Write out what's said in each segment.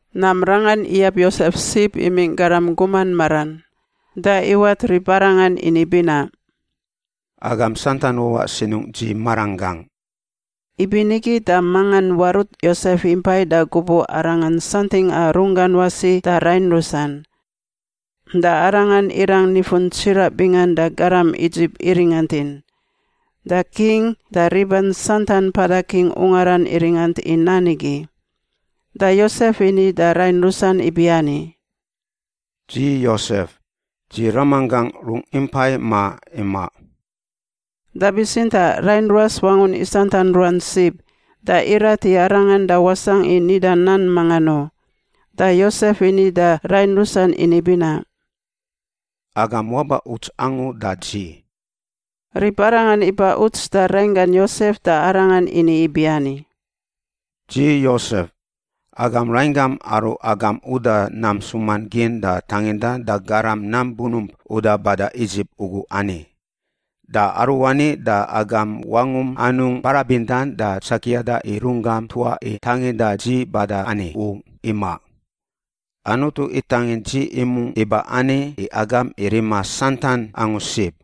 Nam rangan iyab Yosef sib imingꞌ garam guman maran, da iwat ribarangan ini binaꞌ, “Agam santan wawaꞌ sinungꞌ dzi maranggangꞌ.” Ibinigi da mangan warut Yosef impai da gubuꞌ arangan santingꞌa runggan wasi da rain rusan. Da arangan irang nifun tsiraꞌ bingan da garam Idzip iringantin, da king da riban santan mpada king ungaran iringant i nan igi. Da Yosef ini da rain rusan ibiani, “Dzi Yosef! Dzi ramanggangꞌ rungꞌ impai ma imaꞌ?” Da bitsintaꞌ rain ruas wangun isantan ruan sib, da irat i arangan da wasangꞌ i nida nan mangan u. Da Yosef ini da rain rusan ini binaꞌ, “Agam waba uts angu da dzi.” Ribarangan iba uts da rainggan Yosef da arangan ini ibiani, “Dzi Yosef, agam rainggam aru agam uda nam ntsuman gin da tangindan da garam nam bunump uda bada Idzip ugu ani! Da aruani da agam wangum anungꞌ barabindan da tsakiada i runggam tuaꞌ i tanginda dzi bada ani u, imaꞌ. Anutu itangin dzi imungꞌ iba ani i agam i rima santan angu sib.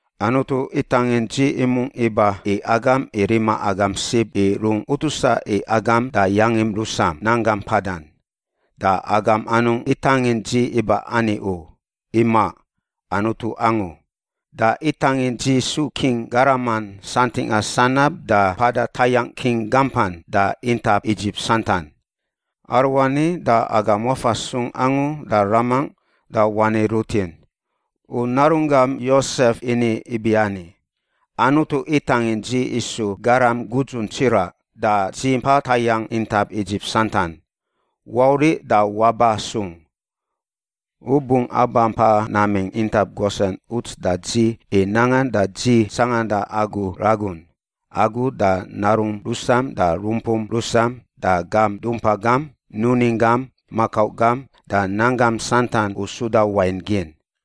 Anutu itangin dzi imungꞌ iba i agam i rima agam sib i rungꞌ utusa i agam da yangin rusam nanggam mpadan. Da agam anungꞌ itangin dzi iba ani u. Imaꞌ. Anutu angu. Da itangin dzi su king garaman santingꞌa sanab da mpada tayangꞌ king gampan da intap Idzip santan. Aruani da agam wafa sung angu da ramangꞌ da wani rutin, ‘U narunggam Yosef ini ibiani: Anutu itangin dzi isu garam gudzun tsiraꞌ da dzi mpa tayangꞌ intap Idzip santan. Wauriꞌ da waba sung. U bungꞌ aba mpa namingꞌ intap Gosen uts da dzi i nangan da dzi tsanganda agu ragun— agu da narum rusam da rumpum rusam da gam dumpa gam, nuning gam, makau gam da nanggam santan u suda wain gin.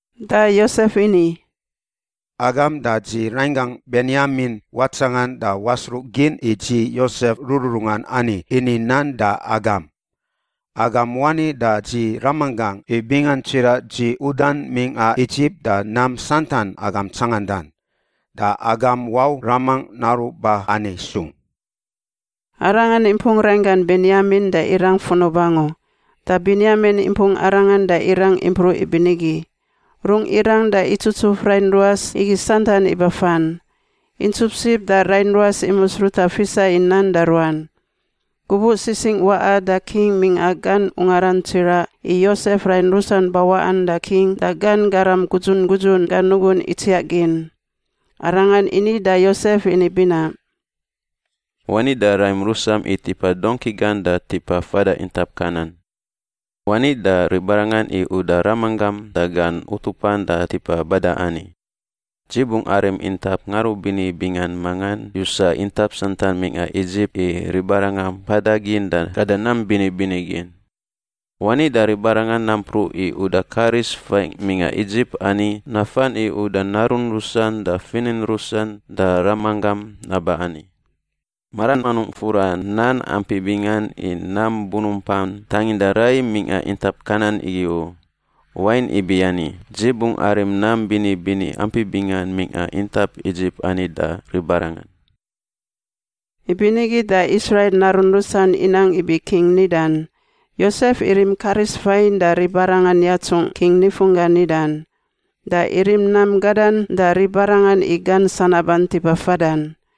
Da Yosef ini, “Agam da dzi rainggangꞌ Benyamin watsangan da wasruꞌgin i dzi Yosef rururungan ani ini nan da agam. Agam wani da dzi ramanggangꞌ i bingan tsiraꞌ dzi udan mingꞌa Idzip da nam santan agam tsangandan. Da agam wau ramangꞌ naruꞌ ba ani sung.” Arangan impung rainggan Benyamin da irang funub angu, da Benyamin impung arangan da irang impruꞌ ibinigi. Rungꞌ irang da itsutsuf rain ruas igi santan ibafan. Intsup sib da rain ruas imus ruta fisa i nan da ruan. Gubuꞌ sisingꞌ waꞌa da king mingꞌa gan ungaran tsiraꞌ i Yosef rain rusan bawaꞌan, da king da gan garam gudzun gudzun gan nugun itsiaꞌ gin. Arangan ini da Yosef ini binaꞌ, “Wani da raim rusam i tipa dongki gan da tipa fada intap Kanan. Wani da ribarangan i uda ramanggam da gan utupan da tipa bada ani. Dzi bungꞌ arim intap ngarubini bingan mangan yusa intap santan mingꞌa Idzip i ribarangan mpada gin da gada nam bini bini gin. Wani da ribarangan nampruꞌ i uda karis fain mingꞌa Idzip ani nafan i uda narun rusan da finin rusan da ramanggam naba ani. Maran anungꞌ fura nan ampi bingan i nam bunumpan tanginda rai mingꞌa intap Kanan igi u, wain ibiani, dzi bungꞌ arim nam bini bini ampi bingan mingꞌa intap Idzip ani da ribarangan.” Ibinigi da Israil narun rusan inang ibi king nidan. Yosef irim karis fain da ribarangan yatsungꞌ king nifunggan nidan. Da irim nam gadan da ribarangan i gan sanaban tipa fadan.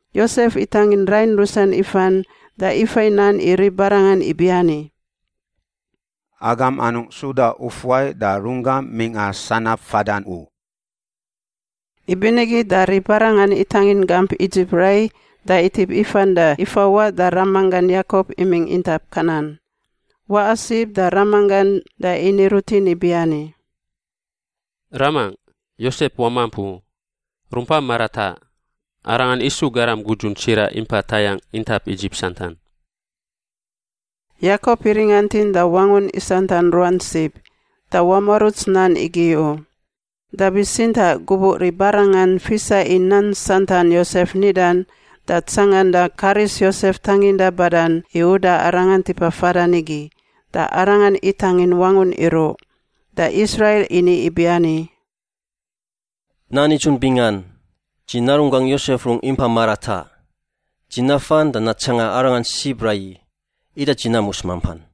Yosef itangin rain rusan ifan da ifai nan i ribarangan ibiani, “Agam anungꞌ suda ufuai da rungam mingꞌa sanab fadan u.” Ibinigi da ribarangan itangin gamp Idzip rai da itip ifan da ifawaꞌ da ramanggan Yakop imingꞌ intap Kanan. Waꞌa sib da ramanggan da ini rutin ibiani, “Ramangꞌ, Yosef wamamp u; rumpa marataꞌ! Arangan isu garam gudzun tsiraꞌ impa tayangꞌ intap Idzip santan.” Yakop iringantin da wangun isantan ruan sib, da wamuaruts nan igi u. Da bitsintaꞌ gubuꞌ ribarangan fisa i nan santan Yosef nidan da tsanganda karis Yosef tanginda badan i uda arangan tipa fadan igi, da arangan itangin wangun iruꞌ. Da Israil ini ibiani, “Nan nidzun bingan! Dzi narunggangꞌ Yosef rungꞌ impa marataꞌ. Dzi nafan da natsanga arangan sib raiyi, ida dzi namus mampan.”